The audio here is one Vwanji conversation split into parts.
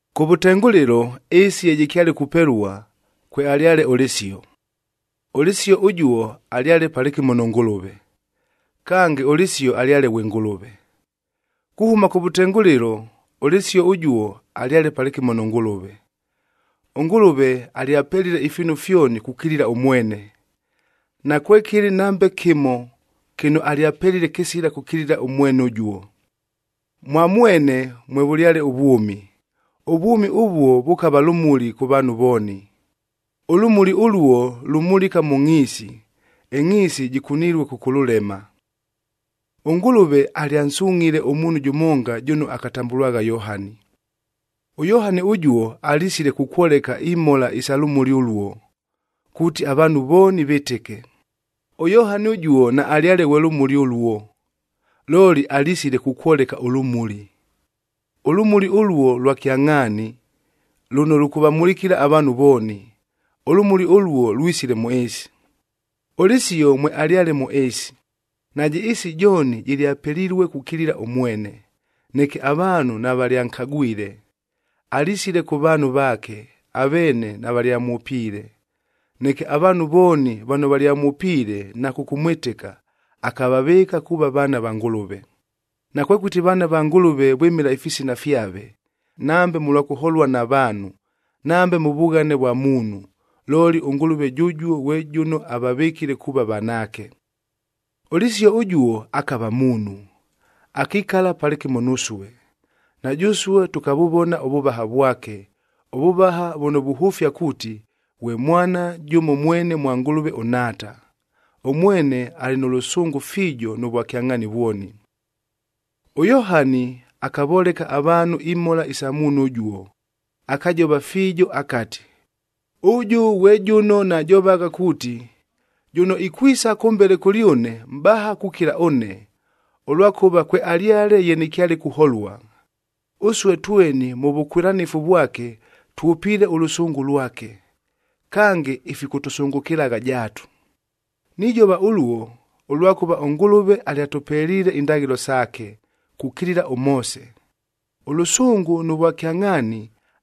Kʉvʉtengʉlɨlo, ɨɨsi ye jɨkyale kupelua, kwealyale ʉLɨsio. ɄLɨsio ʉjuo alyale palɨkɨmo nʉ Ngʉlʉve. Kange, ʉLɨsio alyale ghwe Ngʉlʉve. Kuhʉma kʉvʉtengʉlɨlo, ʉLɨsio ʉjuo alyale palɨkɨmo nʉ Ngʉlʉve. ɄNgʉlʉve alyapelile ifiinu fyoni kukilila ʉmwene. Nakwekɨlɨ nambe kɨmo kɨno alyapelile kɨsila kʉkilila ʉmwene ʉjuo. Mwa mwene mwevʉlyale ʉvwʉmi. Ʉvwʉmi ʉvuo vʉkava lʉmuli kʉ vaanhu vooni. Ʉlʉmuli ʉluo lumulika mʉ ngʼhiisi, ɨngʼhiisi jɨkunilue kʉkʉlʉlema. ɄNgʉlʉve alyansungʼhile ʉmuunhu jʉmonga jʉno akatambʉlwagha Yohani.a ɄYohani ʉjuo, alisile kukwoleka imhola isa lʉmuli ʉluo, kuuti avaanhu vooni vɨtɨke. ɄYohani ʉjuo naalyale ghwe lʉmuli ʉluo, looli alisile kukwoleka ʉlʉmuli. Ʉlʉmuli ʉluo lwa kyangʼhaani, lʉno lʉkʉvamulikila avaanhu vooni. Ʉlʉmuli ʉluo lwisile mʉ ɨɨsi. ɄLɨsio mwealyale mʉ ɨɨsi, najɨ ɨɨsi jooni jɨlyapelilue kukilila ʉmwene, neke avaanhu navalyankagwile. Alisile kʉ vaanhu vaake, aveene navalyamwʉpiile. Neke avaanhu vooni vano valyamwʉpiile na kʉkʉmwɨtɨka, akavavɨɨka kuuva vaana va Ngʉlʉve. Nakwekʉti vaana va Ngʉlʉve vwɨmɨla ifisina fyave, nambe mʉlwa kʉholua na vaanhu, nambe mʉ vughane vwa muunhu, looli ʉNgʉlʉve jʉjuo ghwe jʉno avavɨkile kuuva vanaake. ɄLɨsio ʉjuo akava muunhu, akikala palɨkɨmo nusue. Na jʉsue tʉkavʉvona ʉvʉvaha vwake, ʉvʉvaha vʉno vuhʉfia kuuti, ghwe Mwana jʉmo mwene ghwa Ngʉlʉve ʉNhaata. Ʉmwene alɨ nʉ lʉsʉngʉ fiijo nʉ vwakyangʼhaani vwoni. ɄYohani akavoleka avaanhu imhola isa muunhu ʉjuo, akajova fiijo akati, “Ʉjʉ ghwe jʉno najovagha kuuti, ‘Jʉno ikwisa kʉmbele kʉlyʉne, mʼbaha kukila ʉne, ʉlwakʉva kwealyale ye nɨkyale kuholua.’” Ʉsue tweni mʉ vʉkwɨlanɨfu vwake, twʉpiile ʉlʉsʉngʉ lwake, kange ifikʉtʉsʉngʉkɨlagha jaatu. Nijova ʉluo, ʉlwakʉva ʉNgʉlʉve alyatʉpeliile indaghɨlo saake, kukilila ʉMoose; ʉlʉsʉngʉ nʉ vwakyangʼhaani,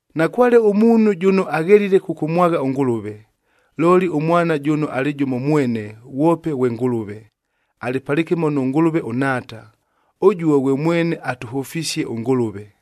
Nakwale ʉmuunhu jʉno aghelile kʉkʉmwagha ʉNgʉlʉve, looli ʉMwana jʉno alɨ jʉmo mwene, ghwope ghwe Ngʉlʉve,c alɨ palɨkɨmo nʉ Ngʉlʉve ʉNhaata. Ʉjuo ghwe mwene atʉhʉfisie ʉNgʉlʉve.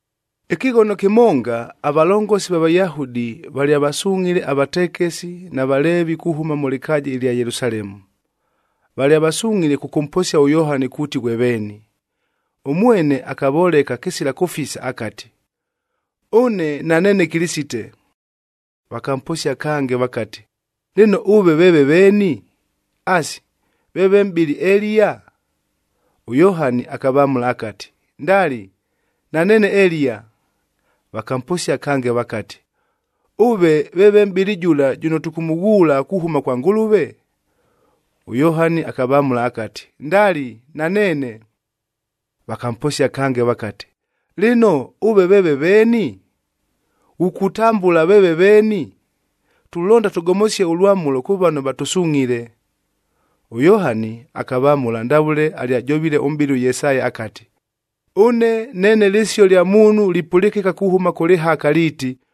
Ɨkɨghono kɨmonga, avalongosi va Vayahudi valyavasungʼhile avatekesid na Valeevie kuhʉma mʉ lɨkaaja ɨlya Yelusalemu. Valyavasungʼhile kʉkʉmposia ʉYohani kuuti ghwe veeni. Ʉmwene akavoleka kɨsila kʉfisa akati, “Ʉne naneene Kɨlɨsite.” Vakamposia kange vakati, “Lɨno, ʉve veeve veeni? Asi, veeve mʼbɨli Eliya?” ɄYohani akavamʉla akati, “Ndali, naneene Eliya.” Vakamposia kange vakati, “Ʉve veeve mʼbɨli jʉla jʉno tʉkʉmʉghuula kuhʉma kwa Ngʉlʉve?”f ɄYohani akavamʉla akati, “Ndali, naneene.” Vakamposia kange vakati, “Lɨno, ʉve veeve veeni? Ghukutambʉla veeve veeni? Tulonda tʉgomosie ʉlwamʉlo kʉ vano vatʉsungʼhile.” ɄYohani akavamʉla ndavʉle alyajovile ʉmʼbɨli ʉYesaya akati, “Ʉne neene lɨsio lya muunhu lipʉlɨkɨka kuhʉma kʉ lɨhaka liiti,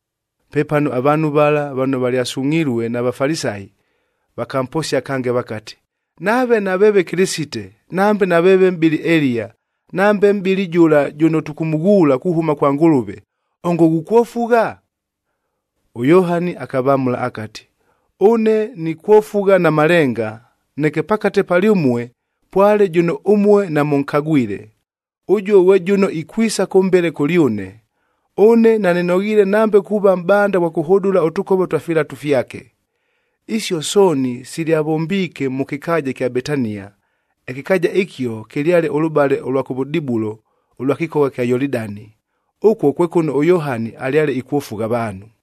Pepano avaanhu vala vano valyasungʼhilue na Vafalisayi,h vakamposia kange vakati, “Nave naveeve Kɨlɨsite, nambe naveeve mʼbɨli Eliya, nambe mʼbɨli jʉla jʉno tʉkʉmʉghuula kuhʉma kwa Ngʉlʉve, ongo ghukwofugha?” ɄYohani akavamʉla akati, “Ʉne nikwofugha na malenga, neke pakate palyʉmue pwale jʉno ʉmue namʉnkagwile. Ʉjuo ghwe jʉno ikwisa kʉmbele kʉlyʉne. Ʉne nanɨnoghiile nambe kuuva mʼbanda ghwa kʉhʉdʉla ʉtʉkova twa filatu fyake.” Isio sooni silyavombiike mʉ kɨkaaja ɨkya Betania. Ɨkɨkaaja ɨkio kɨlyale ʉlʉbale ʉlwa kʉvʉdibulo ʉlwa kɨkogha ɨkya Yolidani. Ʉkuo kwe kʉno ʉYohani alyale ikwofugha avaanhu.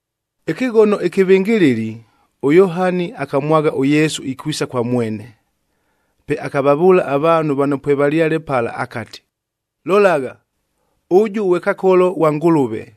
Ɨkɨghono ɨkɨvɨngɨlɨli, ʉYohani akamwagha ʉYesu ikwisa kwa mwene. Pe akavavʉʉla avaanhu vano pwevalyale pala akati, “Lolagha, ʉjʉ ghwe Kakoloi ghwa Ngʉlʉve,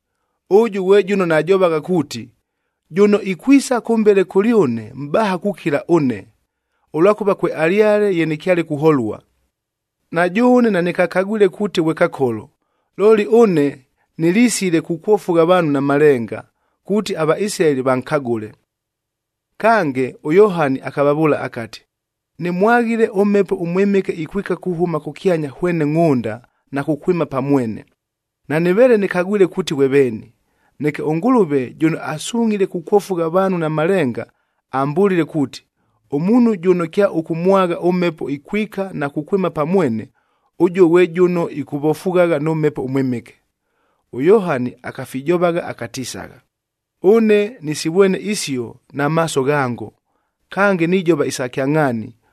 Ʉjʉ ghwe jʉno najovagha kuuti, ‘Jʉno ikwisa kʉmbele kʉlyʉne, mʼbaha kukila ʉne, ʉlwakʉva kwealyale ye nɨkyale kuholua.’ Na jʉʉne nanɨkakagwile kuuti ghwe Kakolo, looli ʉne nɨlisile kukwofugha avaanhu na malenga, kuuti aVaisilaeli vankagʉle.” Kange ʉYohani akavavʉʉla akati, “Nɨmwaghile ʉMhepo ʉMwɨmɨke ikwika kuhʉma kʉkyanya hwene ngʼhʉnda na kukwɨma pa mwene, nanɨveele nɨkagwile kuuti ghwe veeni. Neke ʉNgʉlʉve jʉno asungʼhile kukwofugha avaanhu na malenga ambʉlile kuuti, ‘Ʉmuunhu jʉno kyaʉkʉmwagha ʉMhepo ikwika na kukwɨma pa mwene, ʉjuo ghwe jʉno ikwofughagha nʉ Mhepo ʉMwɨmɨke.’” ɄYohani akafijovagha akatisagha, “Ʉne nɨsivwene isio na maaso ghango, kange nijova isa kyangʼhaani,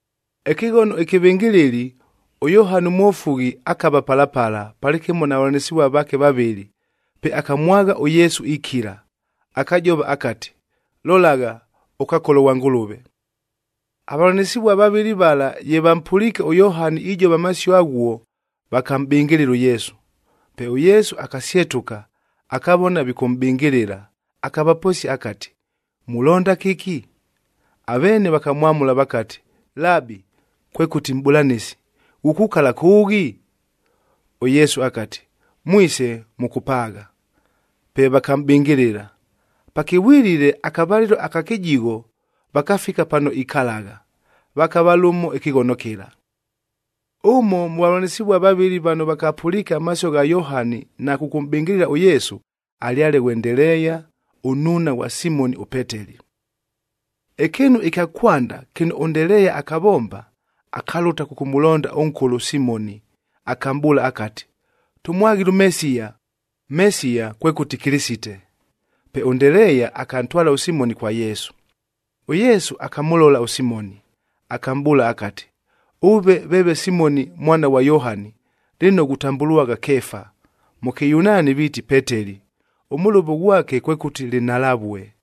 Ɨkɨghono ɨkɨvɨngɨlɨli, ʉYohani ʉMwofughi akava pala pala, palɨkɨmo na vavʉlanɨsɨvual vaake vavɨlɨ. Pe akamwagha ʉYesu ikila, akajova akati, “Lolagha, ʉKakolo ghwa Ngʉlʉve!” Avavʉlanɨsɨvua vavɨlɨ vala ye vampʉliike ʉYohani ijova amasio aghuo, vakamʼbɨngɨlɨla ʉYesu. Pe ʉYesu akasyetʉka, akavona vikʉmʼbɨngɨlɨla, akavaposia akati, “Mulonda kɨki?” Aveene vakamwamʉla vakati, “Labi, kwekʉti Mʼbʉlanɨsi, ghukukala kʉʉghi?” ɄYesu akati, “Mwise, mʉkʉpaagha.” Pe vakamʼbɨngɨlɨla. Pakɨvwilile, akavalɨlo aka kɨjigho, vakafika pano ikalagha, vakava lʉmo ɨkɨghono kɨla. Ʉmo mʉ vavʉlanɨsɨvua vavɨlɨ vano vakapʉliike amasio gha Yohani na kʉkʉmʼbɨngɨlɨla ʉYesu, alyale ghwe Ndeleeya, ʉnnuuna ghwa Simoni ʉPeteli. Ɨkɨɨnu ɨkya kwanda kɨno ʉNdeleeya akavomba, akalʉta kʉkʉmʉlonda ʉnkʉlʉ ʉSimoni, akamʼbʉʉla akati, “Tʉmwaghile ʉMesiya!” Mesiya kwekʉti Kɨlɨsite. Pe ʉNdeleeya akantwala ʉSimoni kwa Yesu. ɄYesu akamʉlola ʉSimoni, akamʼbʉʉla akati, “Ʉve veeve Simoni mwana ghwa Yohani, lɨno ghutambʉlwagha Keefa,”m mʉ Kɨyunaani viiti Peteli, ʉmʉlʉvo ghwake kwekʉti Lɨnhalavue.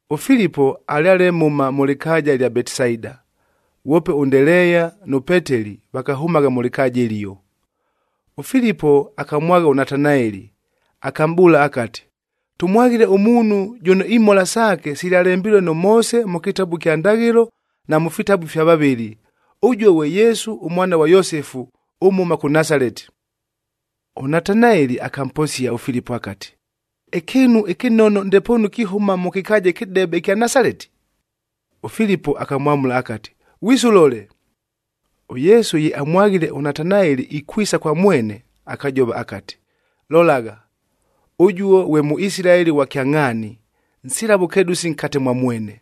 ɄFilipo alyale mhʉma mʉ lɨkaaja ɨlya Betisaida. Ghwope ʉNdeleeya nʉ Peteli vakahʉmagha mʉ lɨkaaja ɨlio. ɄFilipo akamwagha ʉNatanaeli, akamʼbʉʉla akati, “Tʉmwaghile ʉmuunhu jʉno imhola saake silyalembilue nʉ Moose mʉ kɨtabu ɨkya Ndaghɨlo, na mʉ fitabu ifya vavɨli. Ʉjuo ghwe Yesu ʉmwana ghwa Yosefu ʉmhʉma kʉ Nasaleti.” ɄNatanaeli akamposia ʉFilipo akati, “Ɨkɨɨnu ɨkɨnono ndepoonu kihʉma mʉ kɨkaaja ɨkɨdebe ɨkya Nasaleti?” ɄFilipo akamwamʉla akati, “Ghwise, ʉlole!” ɄYesu ye amwaghile ʉNatanaeli ikwisa kwa mwene, akajova akati, “Lolagha, ʉjuo ghwe Mʉisilaeli ghwa kyangʼhaani, nsila vʉkedʉsi nkate mwa mwene.”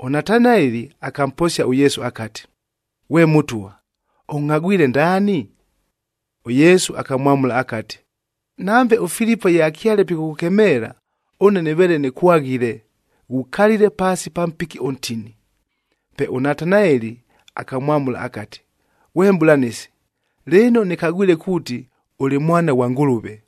ɄNatanaeli akamposia ʉYesu akati, “Ghwe Mʉtwa, ʉngʼhagwile ndaani?” ɄYesu akamwamʉla akati, “Nambe ʉFilipo ye akyale pikʉkʉkemeela, ʉne nɨveele nɨkwaghile, ghukalile paasi pa mpiki ʉntini.” Pe ʉNatanaeli akamwamʉla akati, “Ghwe Mʼbʉlanɨsi, lɨno nɨkagwile kuuti, ʉlɨ Mwana ghwa Ngʉlʉve!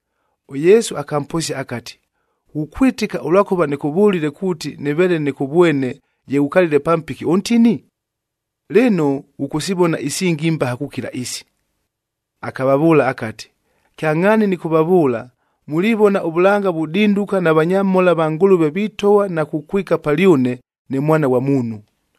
ɄYesu akamposia akati, “Ghukwɨtɨka ʉlwakʉva nɨkʉvʉlile kuuti nɨveele nɨkʉvwene ye ghukalile pa mpiki ʉntini? Lɨno, ghʉkʉsivona isingi imbaha kukila isi!” Akavavʉʉla akati, “Kyangʼhaani nɨkʉvavʉʉla, mulivona ʉvʉlanga vudinduka na vanyamhola va Ngʉlʉve vitogha na kukwikaq palyʉne ne Mwana ghwa Muunhu.”p